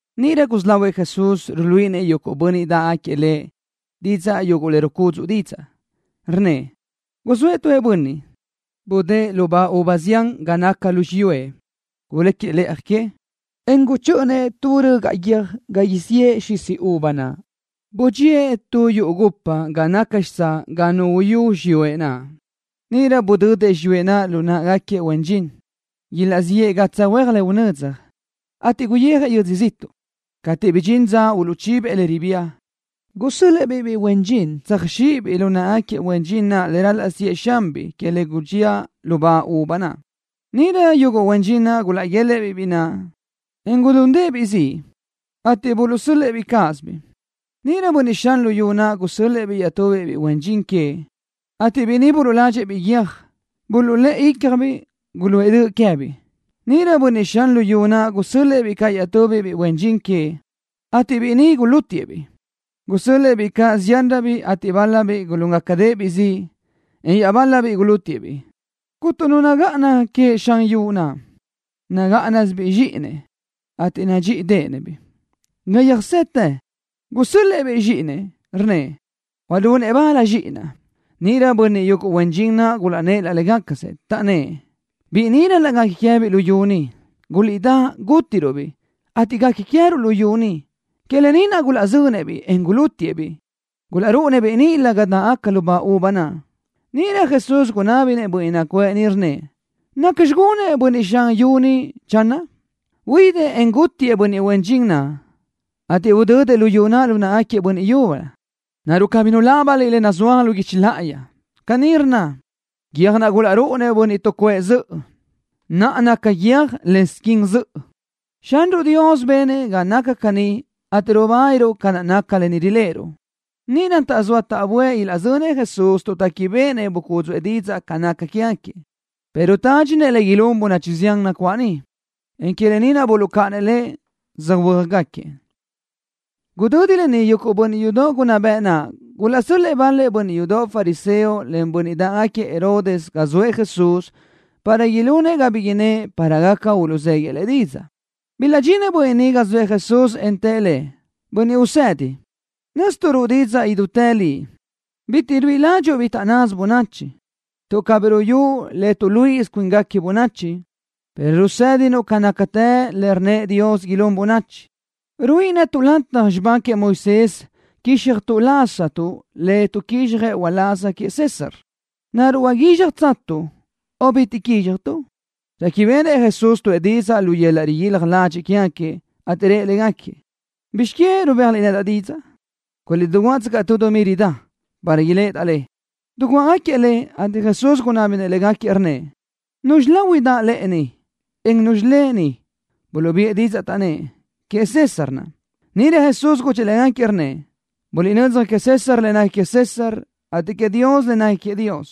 Níʼirö gusí lahuëʼ Jesús ruíʼilenëʼ yuguʼ bönniʼ dáʼgaquiëʼ Lëʼ didzaʼ yuguʼ le rucúdzuʼë didzaʼ, rnnëʼ: —Guzóëʼ tu bönniʼ, budë́ʼë lubá uva zián ga naca lu xiyúëʼ. Guléquiëʼ lëʼa que, en guchö́ʼönëʼ tu rögaʼ guiö́j ga isíëʼ xisi uva naʼ. Budxíëʼ tu yuʼu gupa ga naca xitsáʼ ga nu uyú xiyúëʼ naʼ. ’Níʼirö budödëʼ xiyúëʼ naʼ lu náʼagaquiëʼ huen dxin, ilaʼziʼë gatsaj huéaj le unödzaj, ateʼ guyijëʼ yödzö ziʼtuʼ. Cateʼ bidxín dza uluʼchibëʼ le ribía, gusö́l-lëʼë-biʼ biʼi huen dxin tsöjxíʼibiʼ lu náʼagaquiëʼ huen dxin naʼ le ral-laʼ siʼë xanbiʼ que le gulaʼbía lubá uva naʼ. Níʼirö yuguʼ huen dxin naʼ gulaʼguélëʼë-biʼ biʼi naʼ, en gulundëʼ-biʼ ziʼ, ateʼ buluʼsö́l-lëʼë-biʼ cáʼasöbiʼ. Níʼirö bönniʼ xan luyú naʼ gusö́l-lëʼë-biʼ iaʼtubiʼ biʼi huen dxin queëʼ, ateʼ biʼi ni buluʼladxëʼ-biʼ guiö́j. Buluʼlë́ʼë ícjabiʼ. Guluʼë döʼ queë́biʼ. Níʼirö bönniʼ xan luyú naʼ gusö́l-lëʼë-biʼ caʼ iaʼtubiʼ biʼi huen dxin queëʼ, ateʼ biʼi ni gulútiëʼ-biʼ. Gusö́l-lëʼë-biʼ caʼ ziánröbiʼ, ateʼ bál-labiʼ gulúngacadëʼ-biʼ ziʼ, en iaʼbál-labiʼ gulútigaquiëʼ-biʼ. ’Cúnturö nu nagáʼana queëʼ xan luyú naʼ. Nagáʼanasibiʼ zxíʼinëʼ, ateʼ nadxíʼideʼenëʼ-biʼ. Ga yöjsetë, gusö́l-lëʼë-biʼ zxíʼinëʼ, rnnëʼ: “Ilunëʼ bal zxíʼinaʼ.” Níʼirö yuguʼ bönniʼ huen dxin naʼ gulaʼnnë́ʼ laʼ légacasëʼ, taʼnnë́ʼ: “Biʼi ni ral-laʼ guequi queë́biʼ luyú ni. Guliʼdá, gútiruʼ-biʼ, ateʼ guequi queë́ruʼ luyú ni.” Que lë ni naʼ gulaʼzönëʼ-biʼ, en gulútiëʼ-biʼ. Gulaʼrúʼunëʼ-biʼ níʼilö ga dáʼgaca lubá uva naʼ. Níʼirö Jesús gunábinëʼ bönniʼ nacuʼë niʼ, rnnëʼ: —¿Nacxi gunëʼ bönniʼ xan luyú naʼ, channö? Huidëʼ, en gútigaquiëʼ bönniʼ huen dxin naʼ, ateʼ udödëʼ luyú naʼ lu náʼgaquiëʼ bönniʼ yúbölö. ’¿Naruʼ cabí nulábaniliʼ lë naʼ nazúaj lu guichi láʼayi? Caní rnna: Guiö́j naʼ gulaʼrúʼunëʼ bönniʼ tuʼcuʼë zöʼö, naʼa naca guiö́j len, squin zöʼö. Xanruʼ Dios benëʼ ga naca caní ateʼ rubániruʼ ca naca lë ni riléʼeruʼ. Níʼirö taʼzóa taʼböʼë ilaʼzönëʼ Jesús tuʼ téquibeʼenëʼ bucúdzuʼë didzaʼ ca naca quégaquiëʼ, pero tádxinëʼ le ilún bönachi zián nacuáʼ niʼ, en que lë ni naʼ buluʼcáʼanëʼ Lëʼ, söhuö́jgaquiëʼ. Gudödi lë ni yuguʼ bönniʼ yudoʼ unná bëʼ naʼ gulaʼsö́l-lëʼë bal-lëʼ bönniʼ yudoʼ fariseo len bönniʼ dáʼgaquiëʼ Herodes ga zoëʼ Jesús para ilunëʼ ga bi innë́ʼ para gaca uluʼzéguiëʼ Lëʼ didzaʼ. Bilaʼdxinëʼ bönniʼ ni ga naʼ zoëʼ Jesús, en tëʼ Lëʼ: —Bönniʼ Usedi, nö́zituʼ ruʼu didzaʼ idútë li. Bitiʼ ruíʼi ládxuʼu bi taʼnnasö bönachi, tuʼ cabí ruyusuʼ le tuʼluíʼisö cuínguequi bönachi, pero rusë́dinuʼ ca nácatë le rë́ʼënëʼ Dios ilún bönachi. ¿Ruíʼi netuʼ lataj xibá queëʼ Moisés quizxaj laztuʼ le tuʼquizxjëʼ uláz queëʼ César? ¿Naruʼ uguízxajtuʼ o bitiʼ quízxajtuʼ? Réquibeʼenëʼ Jesús tuʼë didzaʼ lu yöl-laʼ riguílaj ladxiʼ quégaquiëʼ, ateʼ rëʼ légaquiëʼ: —¿Bizx que rubéajliʼ nedaʼ didzaʼ? Guliʼdiguáʼtsöcaʼ tu dumí ridá para iléʼedaʼ le. Diguáʼagaquiëʼ le, ateʼ Jesús gunábinëʼ légaquiëʼ, rnnëʼ: —¿Nuzxi lahui daʼ lëʼe ni, en nuzxi lë ni? Buluʼbiʼë didzaʼ, taʼnnë́ʼ: —Queëʼ César naʼ. Níʼirö Jesús gudxëʼ légaquiëʼ, rnnëʼ: —Buliʼnödzaj queëʼ César le nequi queëʼ César, ateʼ queëʼ Dios le nequi queëʼ Dios.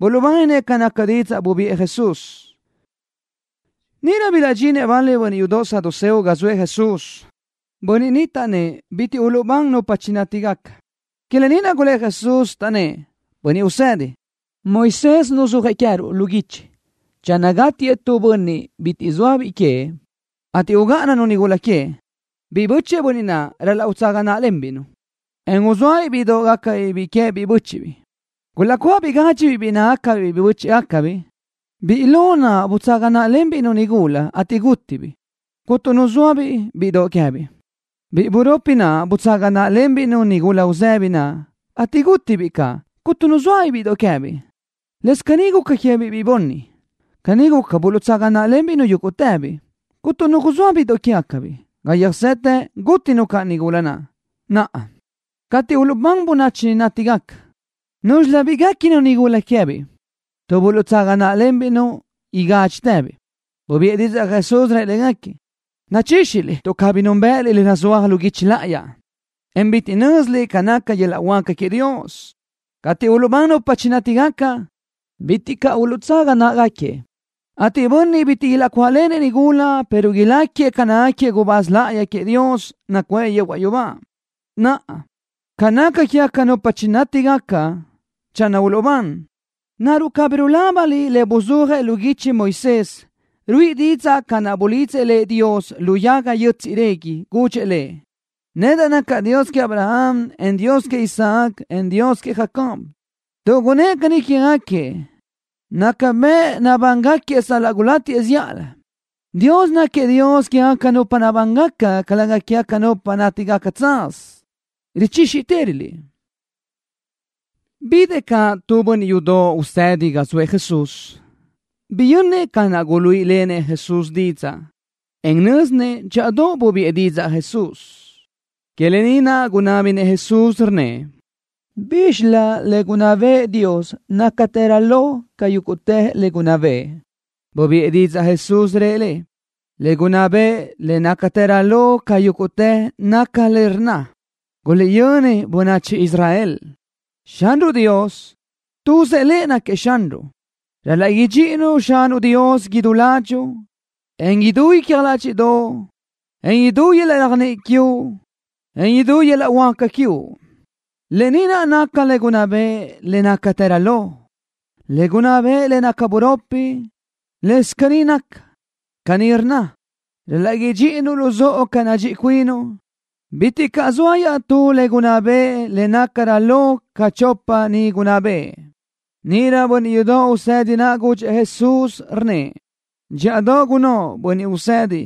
Buluʼbáninëʼ ca naca didzaʼ bubiʼë Jesús. Níʼirö bilaʼdxinëʼ bal-lëʼ bönniʼ yudoʼ saduceo ga zoëʼ Jesús. Bönniʼ ni taʼnnë́ʼ bitiʼ uluʼbán nupa chinátigaca. Que lë ni naʼ gulë́ʼ Jesús, taʼnnë́ʼ: —Bönniʼ Usedi, Moisés nuzúajëʼ queë́ruʼ lu guichi channö gátiëʼ tu bönniʼ bitiʼ zoa biʼi queëʼ, ateʼ ugáʼananu nigula queëʼ, biʼi bö́chëʼë bönniʼ naʼ ral-laʼ utsaga náʼalenbiʼ-nu, en uzóabiʼ bíʼidoʼ gácabiʼ biʼi queë́biʼ bö́chiʼbiʼ. Gulaʼcuáʼabiʼ gádxibiʼ biʼi nácagacabiʼ bö́chiʼgacabiʼ. Biʼi huáca naʼ butsaga náʼalenbiʼ-nu nigula, ateʼ gútibiʼ, cuntu nu zoa bíʼidoʼ queë́biʼ. Biʼi buropi naʼ butsaga náʼalenbiʼ-nu nigula uzëbi naʼ, ateʼ gútibiʼ caʼ, cuntu nu zoa bíʼidoʼ queë́biʼ. Lëscaʼ caní guca queë́biʼ biʼi bunni. Caní guca, buluʼtsaga náʼalenbiʼ-nu yúguʼtëbiʼ, cuntu nu zoa bíʼidoʼ quégacabiʼ. Ga yöjsetë, gútinu caʼ nigula naʼ. Naʼa, cateʼ uluʼbán nupa chinátigaca, ¿núzxilöbiʼ guéquinu nigula naʼ queë́biʼ, tuʼ buluʼtsaga náʼalenbiʼ-nu igádxitëbiʼ? Bubiʼë didzaʼ Jesús, rëʼ légaquiëʼ: —Richíxiliʼ tuʼ cabí núnbëʼëliʼ le nazúaj lu guichi láʼayi, en bitiʼ nö́ziliʼ ca naca yöl-laʼ huáca queëʼ Dios. Cateʼ uluʼbán nupa chinátigaca, bitiʼ caʼ uluʼtsaga náʼagaquiëʼ, ateʼ yuguʼ bönniʼ bitiʼ ilaʼcuáʼlenëʼ nigula, pero ilácagaquiëʼ ca nácagaquiëʼ gubáz láʼayi queëʼ Dios, nacuʼë yehuaʼ yubá. Naʼa, ca naca quégaca nupa chinátigaca channö uluʼbán, ¿naruʼ cabí nulábaniliʼ le buzúajëʼ lu guichi Moisés? Ruíʼi didzaʼ ca naʼ bulidzëʼ Dios lëʼ lu yaga yö́tsiʼdoʼ régui. Gudxëʼ lëʼ: “Nedaʼ nacaʼ Dios queëʼ Abraham, en Dios queëʼ Isaac, en Dios queëʼ Jacob.” Tuʼ gunnë́ʼ caní quégaquiëʼ, naca bëʼ nabángaquiëʼ sal-laʼ gulátiëʼ zíʼalö. Dios náquiëʼ Dios quégaca nupa nabángaca, calëga quégaca nupa nátigaca tsaz. Richíxitëröliʼ. Bidëʼ caʼ tu bönniʼ yudoʼ usedi ga zoëʼ Jesús. Biyönnëʼ ca naʼ guluíʼilenëʼ Jesús didzaʼ, en nö́zinëʼ dxíʼadoʼ bubiʼë Jesús didzaʼ. Que lë ni naʼ gunábinëʼ Jesús, rnnëʼ: —¿Bízxilö le gunná bëʼë Dios nácatërö lo ca yúguʼtë le gunná bëʼë? Bubiʼë didzaʼ Jesús, rëʼ lëʼ: —Le gunná bëʼë le nácatërö lo ca yúguʼtë naca lë naʼ rnna: “Guliʼyöni bönachi Israel. Xanruʼ Dios, tuzëʼ Lëʼ náquiëʼ Xanruʼ. Ral-laʼ idxíʼinuʼ Xanuʼ Dios idú ládxuʼu, en lu idú icja ládxiʼdoʼo, en lu idú yöl-laʼ réajniʼi quiuʼ, en lu idú yöl-laʼ huáca quiuʼ.” Lë ni naca le gunná bëʼë le nácatërö lo. Le gunná bëʼë le naca buropi, lë́bisö ca naca. Caní rnna: “Ral-laʼ idxíʼinuʼ luzóʼo ca nadxíʼi cuinuʼ.” Bitiʼ caʼ zoa iaʼtú le gunná bëʼë le nácarö lo ca chopa ni gunná bëʼë. Níʼirö bönniʼ yudoʼ usedi naʼ gudxëʼ Jesús, rnnëʼ: —Dxíʼadoʼ gunnóʼ, Bönniʼ Usedi.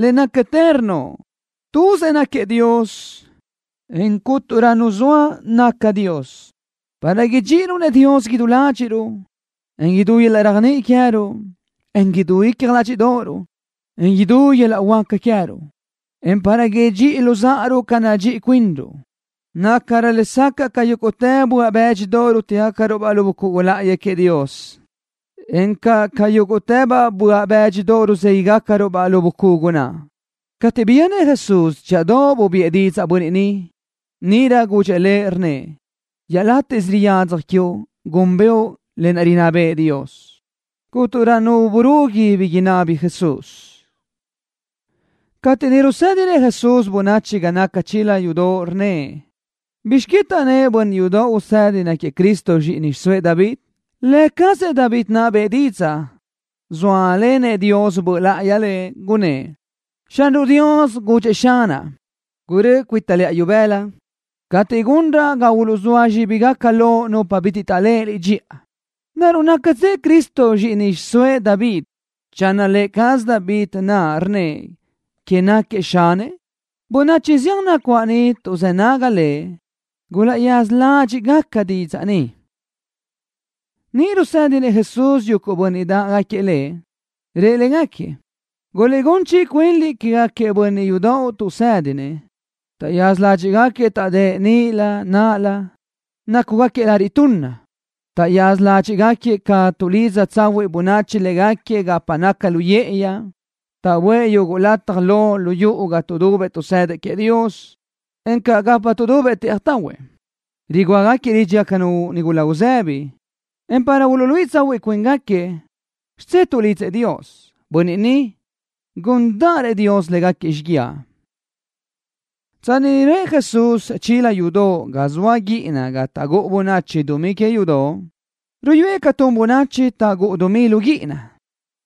Le nácatë rnnoʼ. Tuzëʼ náquiëʼ Dios, en cúnturö nu zoa naca Dios. Para idxíʼiruʼ-nëʼ Dios idú ládxiʼruʼ, en lu idú yöl-laʼ réajniʼi queë́ruʼ, en lu idú icja ládxiʼdoʼoruʼ, en lu idú yöl-laʼ huáca queë́ruʼ, en para idxíʼiruʼ luzáʼaruʼ ca nadxíʼi cuinruʼ, nácarö lesacaʼ ca yúguʼtë böaʼ bë́dxidoʼ rútigacaruʼ-baʼ lu bucugu láʼayi queëʼ Dios, encaʼ ca yúguʼtë böaʼ bë́dxidoʼ ruzéguiʼgacaruʼ-baʼ lu bucugu naʼ. Cateʼ biyönnëʼ Jesús dxíʼadoʼ rubiʼë didzaʼ bönniʼ ni, níʼirö gudxëʼ lëʼ, rnnëʼ: —Iaʼlátiʼsö riyadzaj quiuʼ gúnbëʼu le rinná bëʼë Dios. Cúnturö nu burugui bi inábini Jesús. Cateʼ niʼ rusë́dinëʼ Jesús bönachi ga naca chila yudoʼ, rnnëʼ: —¿Bizx que taʼnnë́ʼ bönniʼ yudoʼ usedi náquiëʼ Cristo zxíʼini xiʼsóëʼ David? Lë cazëʼ David naʼ bëʼë didzaʼ, zóalenëʼ Dios Böʼ Láʼayi lëʼ, gunnë́ʼ: Xanruʼ Dios gudxëʼ Xanaʼ: “Gurö́ʼö cuita lëʼa ibëla cateʼ gunraʼ ga uluʼzóa zxíbigaca loʼ nupa bitiʼ taʼléʼe Liʼ dxiʼa.” ¿Naruʼ nácatsëʼ Cristo zxíʼini xiʼsóëʼ David channö lë cazëʼ David naʼ rnnëʼ queëʼ náquiëʼ Xanëʼ? Bönachi zián nacuáʼ niʼ tuʼzë́ nágagaca Lëʼ gulaʼyaza ládxiʼgaca didzaʼ ni. Niʼ rusë́dinëʼ Jesús yuguʼ bönniʼ dáʼgaquiëʼ Lëʼ, rëʼ légaquiëʼ: —Guliʼgún chiʼi cuinliʼ quégaquiëʼ bönniʼ yudoʼ tuʼsë́dinëʼ. Taʼyaza ládxiʼgaquiëʼ taʼdë́ʼ nilö naʼlö, nácugaquiëʼ lariʼ tunna. Taʼyaza ládxiʼgaquiëʼ caʼ tuʼlidza tsahuiʼ bönachi légaquiëʼ gapa naca lu yë́ʼëyi. Taʼböʼë yuguʼ lataj lo lu yuʼu ga tuʼdubëʼ tuʼsëdëʼ queëʼ Dios, encaʼ gapa tuʼdubëʼ tëʼaj tahuëʼ. Rugúagaquiëʼ lídxigacanu nigula uzëbi, en para uluʼluíʼisö tsahuiʼ cuíngaquiëʼ, xidzé tuʼlidzëʼ Dios. Bönniʼ ni, gúndaʼrëʼ Dios légaquiëʼ xíguiaʼ. Tsanni niʼ röʼë Jesús chila yudoʼ ga zoa guíʼina ga taʼgúʼu bönachi dumí que yudóʼ, ruyúëʼ ca tun bönachi taʼgúʼu dumí lu guíʼina.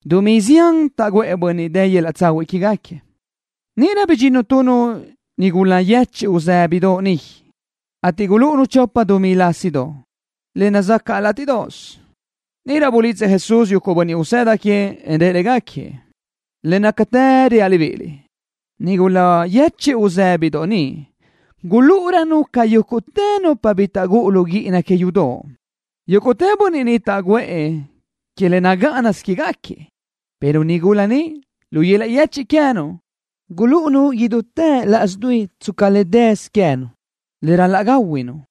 Dumí zián taʼguʼë bönniʼ dë yöl-laʼ tsahuiʼ quégaquiëʼ. Níʼirö bidxinnu tu nigula yechiʼ uzë́bidoʼ niʼ, ateʼ gulúʼunu chopa dumí lásidoʼ, le nazácaʼgaca látiʼdoʼos. Níʼirö bulidzëʼ Jesús yuguʼ bönniʼ usëda queëʼ, en rëʼ légaquiëʼ: —Le nácatë reaʼ libíʼiliʼ, nigula yechiʼ uzë́bidoʼ ni gulúʼurönu ca yúguʼtë nupa bi taʼgúʼu lu guíʼina que yudoʼ. Yúguʼtë bönniʼ ni taʼguʼë que le nagáʼanasö quégaquiëʼ, pero nigula ni, lu yöl-laʼ yéchiʼdoʼ queë́nu gulúʼunu idútë laʼs dui tsca le dësö queë́nu, le ral-laʼ gáhuinu.